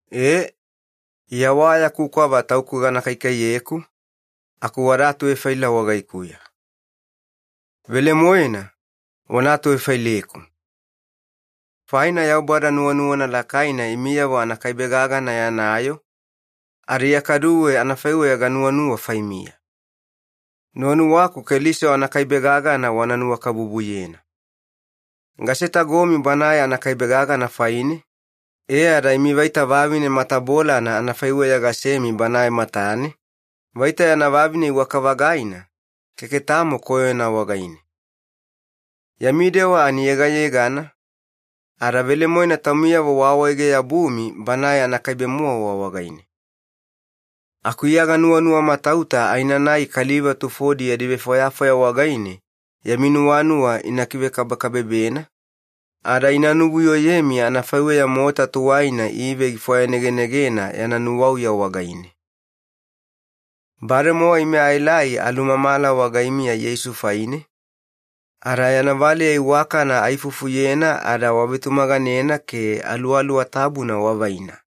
E, Iya wa yaku kwava tauku gana kaikaiyeku, aku wada atuvefaila wagaikuya. Velemoena, wana atuvefaileku. Faina Yaubada nuwanuwana lakaina imiyavo anakaibe-gagana yana yoo, ada Iya kaduwe anafaiweya ganuwanuwa faimiya. Nuwanuwaku Keliso anakaibe-gagana wana nuwakabubuyena. Gasetagomi Banae anakaibe-gagana faine, e ada imi vaita vavine matabolana anafaiweya ganasemi Banae matane, vaita yana vavine iwaka-vagaina, keke tamo koyona wagaine. Yami dewa ani yegayegana, ada velemoena taumiyavo waawaege-yabumi Banae anakaibe-mowa wagaine. Aku Iya ganuwamatauta aenanai kaliva tufodi yadi vefwayafwaya wagaine yami nuwanuwa ina kivekabekabebena, ada ina nuvuyoyemi anafaiweya mota tuwaina Ive gifwayanegenegena yana nuwauya wagaine. Bademowa ime aelai alumamala wagaimiya Yeisu faine, ada yana valeya iwakana aifufuyena ada wavetumaganena ke Aluwaluwa Tabuna wavaina.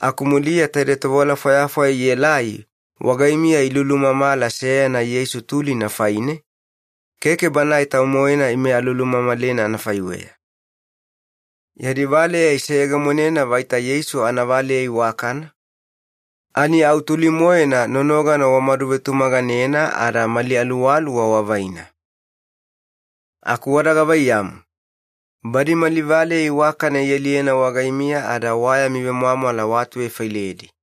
Aku muliya taide tovewala fwayafwaya ielai wagaimiya ilulumamala seyana Yeisu tulina faine, keke Banae Tau-moena ime alulumamalena anafaiweya. Yadi valeya iseyegemonena vaita Yeisu anavaleya iwakana, ani au tuli-moena nonogana wamadu vetumaganena ada mali aluwaluwa wavaina. Aku wada gavaiyamu, badi mali valeya iwakana ialiyena wagaimiya ada wa yami vemwamwala waatuvefailedi.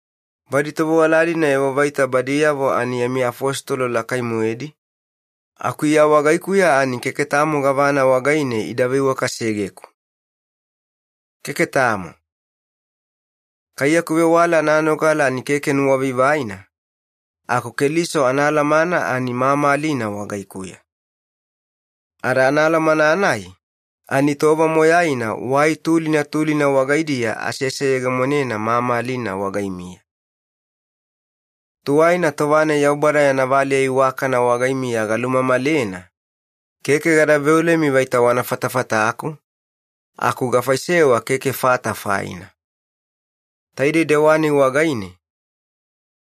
Badi tovewala-dina evo vaita badiyavo ani yami afositolo lakai-moedi, aku Iya wagaikuya ani keke tamo gavana wagaine ida veiwakasegeku. Keke tamo. Kai yaku vewala ananogala ani keke nuwavaivaina, aku Keliso anaalamana ani mamalina wagaikuya. Ada anaalamana-nai, ani tova moyaina wai tulina tulina wagaidiya aseseyegemonena mamalina wagaimiya. Tuwaina tova-nai Yaubada yana valeya iwakana wagaimiya galumamalena, keke gada veolemi vaita wana fatafataku, aku gafaisewa keke fata faina. Taidei dewa-nai wagaine,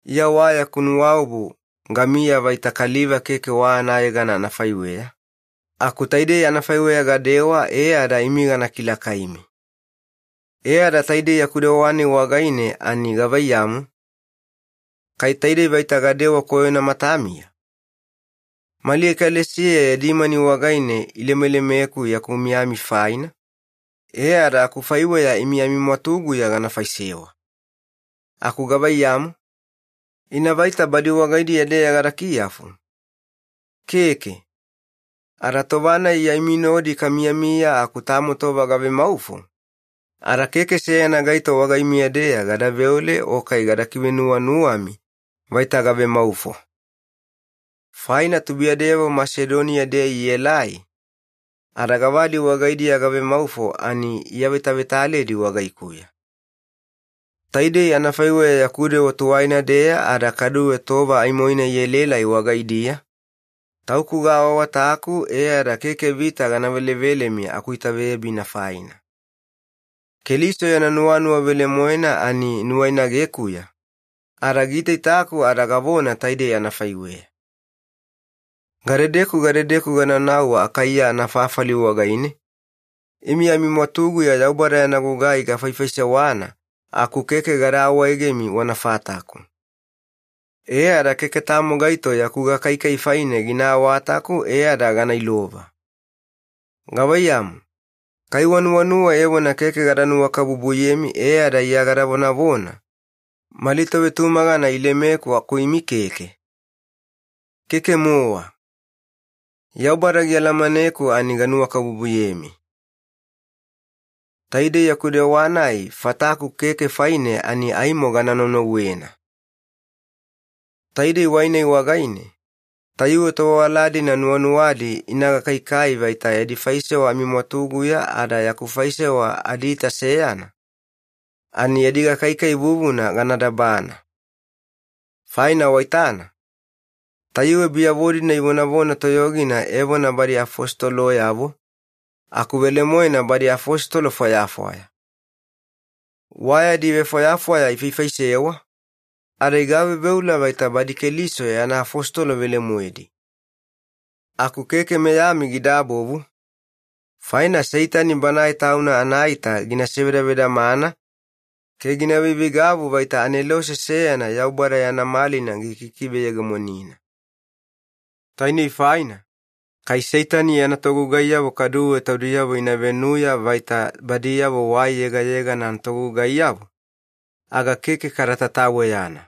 Iya wa yaku nuwaobu gamiya vaita kaliva keke wa anayegana anafaiweya, aku taidei anafaiweya gadewa e ada imi gana kilakaimi. E ada taidei yaku dewa-nai wagaine ani gavaiyamu, kai taidei vaita gadadewa koyona matamiya? Mali ekalesiya yadi mani wagaine ilemelemeku yaku miyami faina, e ada akufaiweya imi amimwatuguya gana faisewa. Aku gavaiyamu? Ina vaita badi wagaidiya-deya gada kiyafu? Keke. Ada tova-nai Iya imi nodi kamiyamiya aku tamo tova gavemaufo, ada keke seyana gaito wagaimiya-deya gada veole o kai gada kivenuwanuwami vaita gavemaufo. Faina tubuiyadeyavo Masedoniya-deya ielai, ada gavadi wagaidiya gavemaufo ani iavetavetaledi wagaikuya. Taidei anafaiweya yaku dewa tuwaina-deya ada kaduwe tova aimoina ielaelai wagaidiya, tauku gaawaawataku e ada keke vita gana velevelemi akuitaveyabina faina. Keliso yana nuwanuwa velemoena ani nuwainagekuya, ada giitaitaku ada gavona taidei anafaiweya. Gadedeku gadedeku ganaunau Akaiya anafafali wagaine, imi amimwatuguya Yaubada yana gugai gafaifaisewana aku keke gada awaegemi wana fataku. E ada keke tamo gaito yaku gakaikai faine gina awataku e ada gana ilova. Gavaiyamu, kai wanuwanuwa evona keke gada nuwakabubuyemi e ada Iya gada vonavona, “Mali tovetumagana ilemeku aku imi keke?” Keke-mowa. Yaubada gialamaneku ani ganuwakabubuyemi. Taidei yaku dewa-nai fataku keke faine ani aimo gana naunauwena. Taidei wai-nai wagaine, tayuwe tovewala-dina nuwanuwadi ina gakaikai vaita yadi faisewa amimwatuguya ada yaku faisewa adiita seyana, ani yadi gakaikai vuvuna gana dabana. Faina waitana, tayuwe biyavo-dina ivonavona toyogina evona badi afositoloyavo, aku velemoena badi afositolo fwayafwaya. Wa yadi vefwayafwaya ifaifaisewa, ada igaveuveula vaita badi Keliso yana afositolo velemoedi. Aku keke meyami gidabovu, faina Seitani banae tauna anaita gina sevedavedamana ke gina veiveigavu vaita anelose seyana Yaubada yana malina gikikiveyegemonina. Tainei faina, kai Seitani yana togugaiyavo kaduwe taudiyavo ina venuya vaita badiyavo wai yegayegana anatogugaiyavo, aga keke kada tataweyana.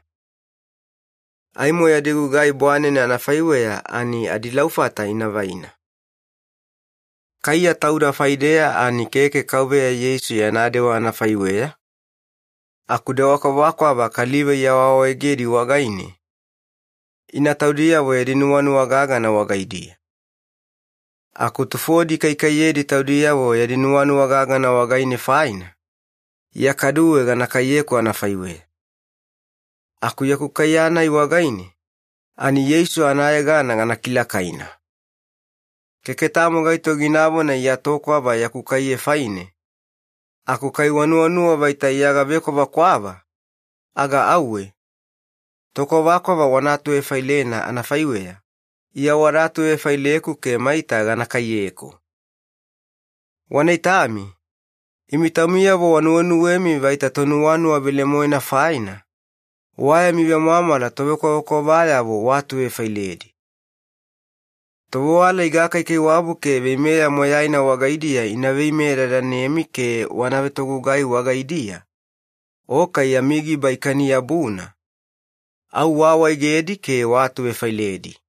Aimo yadi gugai bwanene anafaiweya ani adilaufata ina vaina. Kaiya tauda faideya ani keke Kauveya Yeisu yana dewa anafaiweya, aku dewa kwavakwava kaliva iawaawaegedi wagaine, ina taudiyavo yadi nuwanuwa gagana wagaidiya. Aku tufodi ikaikaiyedi taudiyavo yadi nuwanuwa gagana wagaine faina, Iya kaduwe gana kaiyeku anafaiweya. Aku yaku kaiye-nai wagaine, ani Yeisu anayegana gana kilakaina. Keke tamo gaito ginavona Iya tokwava yaku kaiye faine, aku kai wanuwanuwa vaita Iya gavekwavekwava, aga auwe, tokwavakwava wana atuvefailena anafaiweya, Iya wada atuvefaileku ke maita gana kaiyeku. Wana itami, imi taumiyavo wanuwenuwemi vaita tonuwanuwa velemoemi faina, wa yami vemwamwala tovekwavakwavayavo waatuvefailedi. Tovewala igakaikaiwabu ke veimeya moyaina wagaidiya ina veimeyedadanemi ke wana vetogugai wagaidiya, o kai yami giba ikani-yabuna, au waawaegedi ke waatuvefailedi.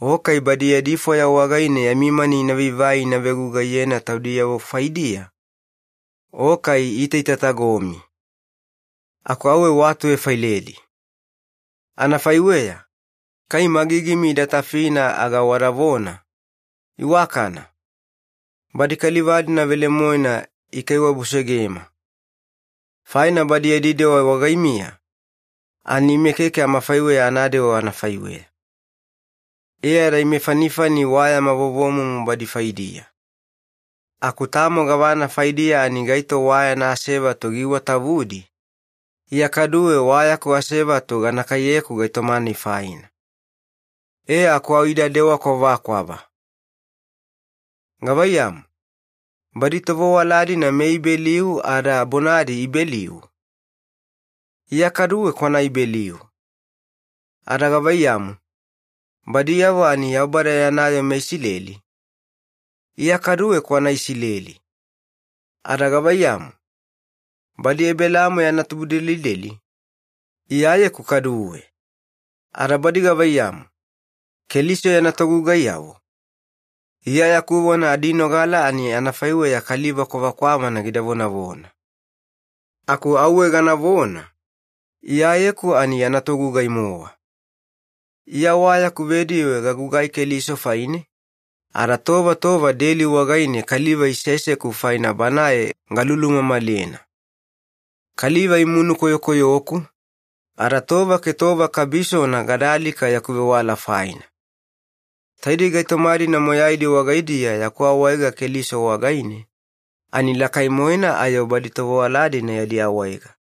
O kai badi yadi fwaya wagaine yami mani ina vaivai ina vegugaiyena taudiyavo faidiya, o kai iitaitatagomi. Aku auwe waatuvefailedi. Anafaiweya, kai magigimi ida tafina aga wadavona, “Iwakana!” Badi kaliva-dina velemoena ikaiwabusegema! Faina badi yadi dewa wagaimiya, ani ime keke amafaiweya anadewa anafaiweya. E ada ime fanifani wa yama vovomumu badi faidiya. Aku tamo gavana faidiya ani gaito wa yana asevatu giiwatavudi, Iya kaduwe wa yaku asevatu gana kaiyeku gaitoma-nai faina. E aku au ida dewa kwavakwava. Gavaiyamu, badi tovewala-dina meIbeliu ada bonadi Ibeliu? Iya kaduwe kwana Ibeliu. Ada gavaiyamu, badiyavo ani Yaubada yana yoo meIsileli? Iya kaduwe kwana Isileli. Ada gavaiyamu, badi Ebelaamo yana tubudelideli? Iyayeku kaduwe. Ada badi gavaiyamu, Keliso yana togugaiyavo? Iya yaku vona adinogala ani anafaiweya kaliva kwavakwavana gida vonavona. Aku auwe ganavona, Iyayeku ani yana togugai-mowa. Iya wa yaku vediwe gagugai Keliso faine, ada tova tova deli wagaine kaliva iseseku faina Banae galulumamalena. Kaliva imunu koyokoyoku, ada tova ke tova kabisona gada alika yaku vewala faina. Taidei gaitoma-dina moyaidi wagaidiya yaku awaega Keliso wagaine, ani lakai-moena ayo badi tovewala-dina yadi awaega.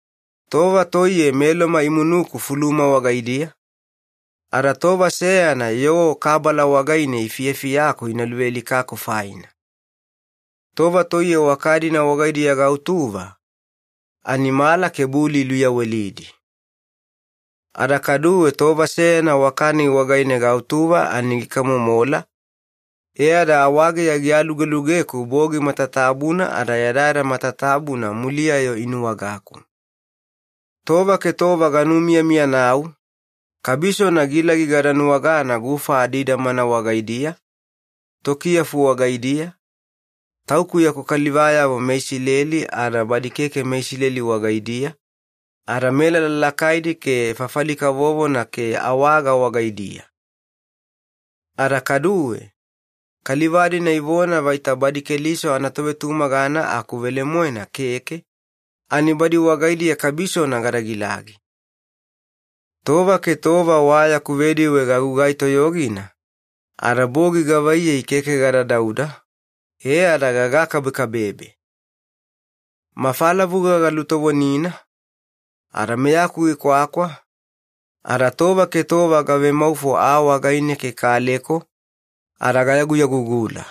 Tova toiye meLoma imunuku fuluma wagaidiya, ada tova seyana yoo kabala wagaine ifiyafiyaku ina luvealikaku faina. Tova toiye waka-dina wagaidiya gautuva, ani mala ke buli iluyawelidi. Ada kaduwe tova seyana waka-nai wagaine gautuva ani gikamomola, e ada awageya gialualugeku bogi matatabuna ada yadayada matatabuna muliya-yo inuwagaku. Tova ke tova ganumiyamiyanau, kabisona gilagi gada nuwagana gufa adidamana wagaidiya, tokiyafu wagaidiya, tauku yaku kalivayavo meIsileli ada badi keke meIsileli wagaidiya, ada melala lakaidi ke fafali kavovona ke awaga wagaidiya. Ada kaduwe, kaliva-dina ivona vaita badi Keliso anatovetumagana aku velemoena keke, ani badi wagaidiya kabisona gada gilagi. Tova ke tova wa yaku vediwe gagugai toyogina, ada bogi gavaiyei keke gada dauda, e ada gagakabekabebe. Mafalavuga galutovonina, ada meyaku gikwakwa, ada tova ke tova gavemaufo aa wagaine ke kaleko, ada gayaguyagugula.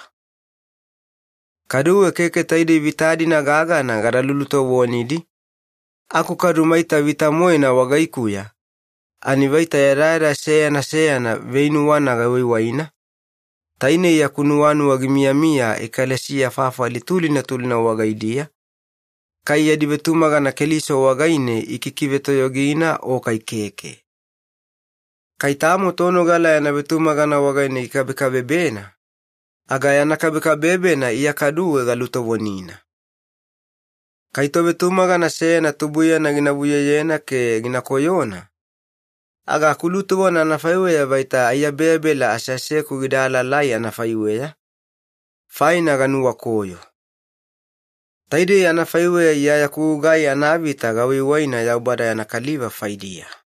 Kaduwe keke taidei vita-dina gagana gada lulutovonidi, aku kadu maita vita-moena wagaikuya, ani vaita yadayada seyana seyana veinuwana gawaiwaina, tainei yaku nuwanuwa gimiyamiya ekalesiya fafali tulina tulina wagaidiya, kai yadi vetumagana Keliso wagaine ikikivetoyogina o kai keke. Kai tamo tonogala yana vetumagana wagaine gikabekabebena, aga yana kabekabebena Iya kaduwe galutovonina. Kai tovetumagana seyana tubuiyana gina vuyoyena ke gina koyona, aga akulutovona anafaiweya vaita aiyabeyabela aseaseku gida alaalai anafaiweya, faina ganuwakoyo. Taidei anafaiweya Iya yaku gugai anavita gawaiwaina Yaubada yana kaliva faidiya.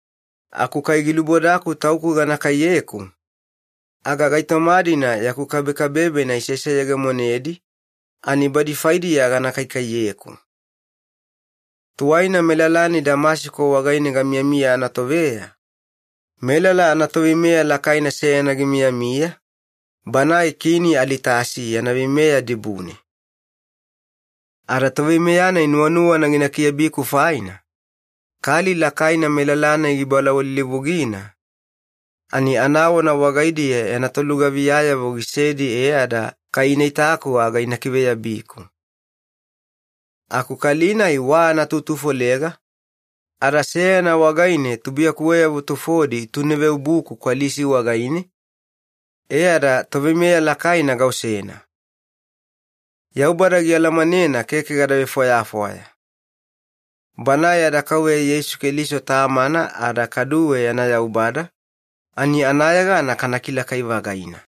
Aku kai gilubodaku tauku gana kaiyeku, aga gaitoma-dina yaku kabekabebena iseseyegemonedi, ani badi faidiya gana kaikaiyeku. Tuwaina melala-nai Damasiko wagaine gamiyamiya anatoveya, melala anatoveimeya lakaina seyana gimiyamiya, banae Kini Alitasi yana veimeya dibune. Ada toveimeya-nai nuwanuwana gina kiabiku faina, kali lakaina melala-nai gibalawalilivugina, ani anawana wagaidiya yana tolugaviyayavo gisedi e ada kai ina itaku aga ina kiveyabiku. Aku kali-nai wa anatutufolega, ada seyana wagaine tubuiyakuweyavo tufodi ituneveobuku kwalisi wagaine, e ada toveimeya lakaina gaosena. Yaubada gialamanena keke gada vefwayafwaya. Banae yada Kauveya Yeisu Keliso Tamana ada kaduwe yana Yaubada, ani anayegana kana kilakai-vagaina.